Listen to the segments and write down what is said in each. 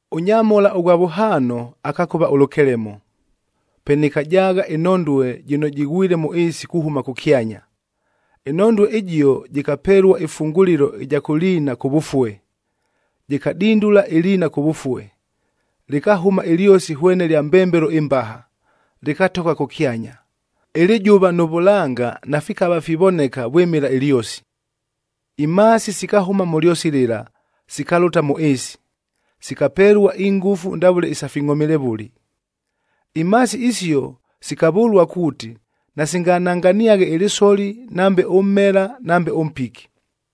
Ʉnyamhola ʉghwa vʉhaano akakʉva ʉlʉkelemo. Pe nɨkajaagha ɨnhondue jɨno jɨghwile mʉ ɨɨsi kuhʉma kʉkyanya. Ɨnhondue ɨjio jɨkapelua ɨfungulilo ɨja kʉ liina kʉvʉfue. Jɨkadindula ɨliina kʉvʉfue, lɨkahʉma ɨlyosi hwene lya mbembelo ɨmbaha, lɨkatogha kʉkyanya. Ɨlɨjʉva nʉ vʉlanga nafikava fivoneka vwɨmɨla ɨlyosi. Imhaasi sikahʉma mʉ lyosi lɨla, sikalʉta mʉ ɨɨsi. Sikapelua ingʉfu ndavʉle isa fingʼhomilevʉli. Imhaasi isio sikavʉlua kuuti, nasingananganiaghe ɨlɨsoli nambe ʉmmela nambe ʉmpiki.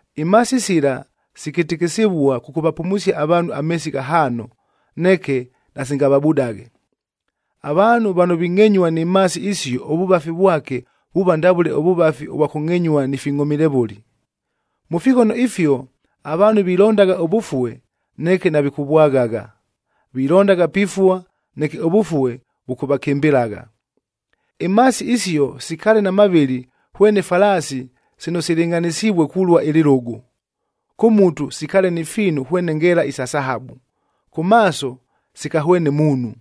Imhaasi sila sikɨtɨkɨsɨvua kʉkʉvapumusia avaanhu ameesi ghahaano, neke nasingavabudaghe. Avaanhu vano vingʼenyua ni mhaasi isio ʉvʉvafi vwake vuuva ndavʉle ʉvʉvafi vwa kʉngʼenyua ni fingʼhomilevʉli. Mʉ fighono ifio avaanhu vilondagha ʉvʉfue neke navikʉvwaghagha, vilondagha pifua, neke ʉvʉfue vʉkʉvakɨmbɨlagha. Imhaasi isio sikaale na mavɨlɨ hwene falaasi sino silɨngʼhanɨsivue kulua ɨlɨlʉgʉ. Kʉ mutu sikaale ni fiinu hwene ngeela isa sahabu, kʉ maaso sikahwene muunhu.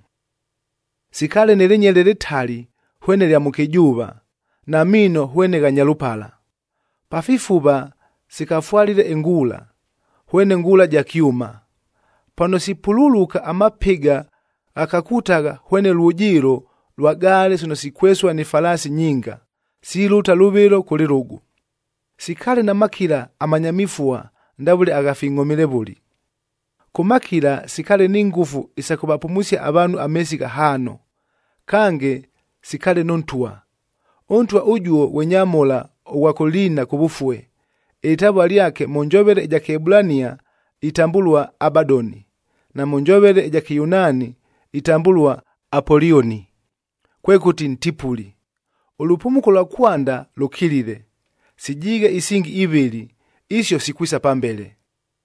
Sikaale nɨ lɨnyele lɨtali hwene lya mʉkɨjʉʉva, na miino hwene gha nyalʉpala. Pa fifuva sikafwalile ingʉla, hwene ngʉla sa kyʉma. Pano sipululuka amapɨga ghakakutagha hwene lwʉjɨɨlo lwa gaale sino sikwesua ni falaasi nyinga, silʉta lʉvɨlo kʉ lɨlʉgʉ. Sikaale na makila amanya mifua ndavʉle agha fingʼhomilevʉli. Kʉ makila sikaale ni ngʉfu isa kʉvapumusia avaanhu ameesi ghahaano. Kange, sikaale nʉ ntwa. Ʉntwa ʉjuo ghwe nyamhola ʉghwa kʉ liina kʉvʉfue, ɨlɨtavua lyake mʉ njovele ɨja Kɨebulania itambʉlua, “Abadoni,” na mʉ njovele ɨja Kɨyunaani itambʉlua, “Apolioni,” kwekʉti, Ntipuli. Ʉlʉpumuko lwa kwanda lʉkilile, sijiighe isingi ivɨlɨ, isio sikwisa pambele.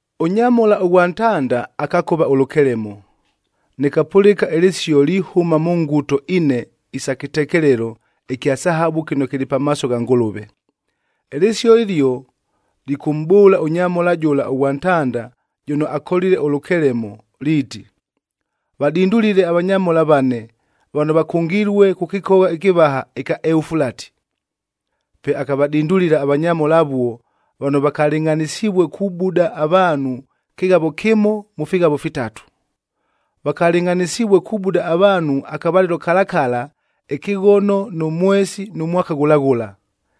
Ʉnyamhola ʉghwa ntanda akakʉva ʉlʉkelemo. Nɨkapʉlɨka ɨlɨsio lihʉma mʉ nguto ine isa kɨtekelelo ɨkya sahabu kɨno kɨlɨ pamaaso gha Ngʉlʉve. Ɨlɨsio ɨlio lɨkʉmʼbʉʉla ʉnyamhola jʉla ʉghwa ntanda jʉno akolile ʉlʉkelemo liiti, “Vadindulile avanyamhola vane vano vakʉngilue kʉ kɨkogha ɨkɨvaha ɨkya Eufulati.” Pe akavadindulila avanyamhola avuo vano vakalɨngʼhanɨsivue kubuda avaanhu ɨkɨghavo kɨmo mʉ fighavo fitatu. Vakalɨngʼhanɨsivue kubuda avaanhu akavalɨlo kala kala, ɨkɨghono, nʉ mwesi nʉ mwaka ghʉla ghʉla.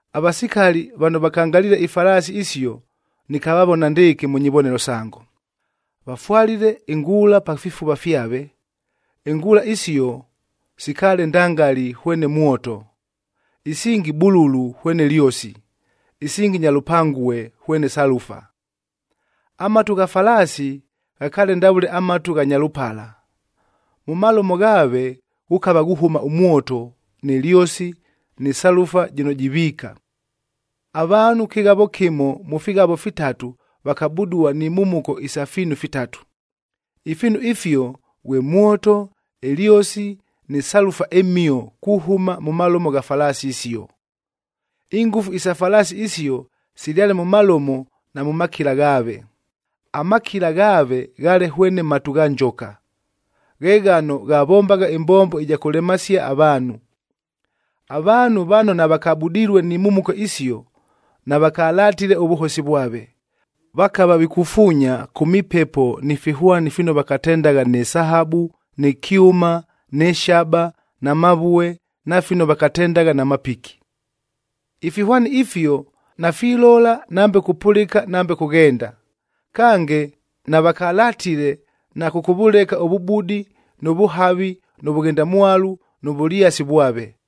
Avasikali vano vakangaliile ifalaasi isio nɨkavavona ndɨɨkɨ mʉ nyivonelo sango: vafwalile ingʉla pa fifuva fyave. Ingʉla isio sikaale ndangali hwene mwoto, isingi bululu hwene lyosi, isingi nyalʉpangue hwene salufa. Amatu gha falaasi ghakaale ndavʉle amatu gha nyalʉpala, mʉ malomo ghaave ghukava ghuhʉma ʉmwoto, nɨ lyosi, nɨ salufab jɨno jiviika. Avaanhu kɨghavo kɨmo mʉ fighavo vitatu vakabudua ni mhumuko isa fiinu fitatu. Ifiinu ifio ghwe mwoto, ɨlyosi nɨ salufa ɨmhio kuhʉma mʉ malomo gha falaasi isio. Ingʉfu isa falaasi isio silyale mʉ malomo na mʉ makila ghaave. Amakila ghaave ghaale hwene matu gha njoka, ghe ghano ghavombagha ɨmbombo ɨja kʉlemasia avaanhu. Avaanhu vano navakabudilue ni mhumuko isio, navakalatile ʉvʉhosi vwave. Vakava vikufuunya kʉ mipepo ni fihwani fino vakatendagha nɨ sahabu, nɨ kyʉma, nɨ shaba, na mavue, na fino vakatendagha na mapiki. Ifihwani ifio nafilola nambe kupʉlɨka nambe kughenda. Kange, navakalatile na kʉkʉvʉleka ʉvʉbudi, nʉ vʉhavi, nʉ vʉghendamwalu nʉ vʉlyasi vwave.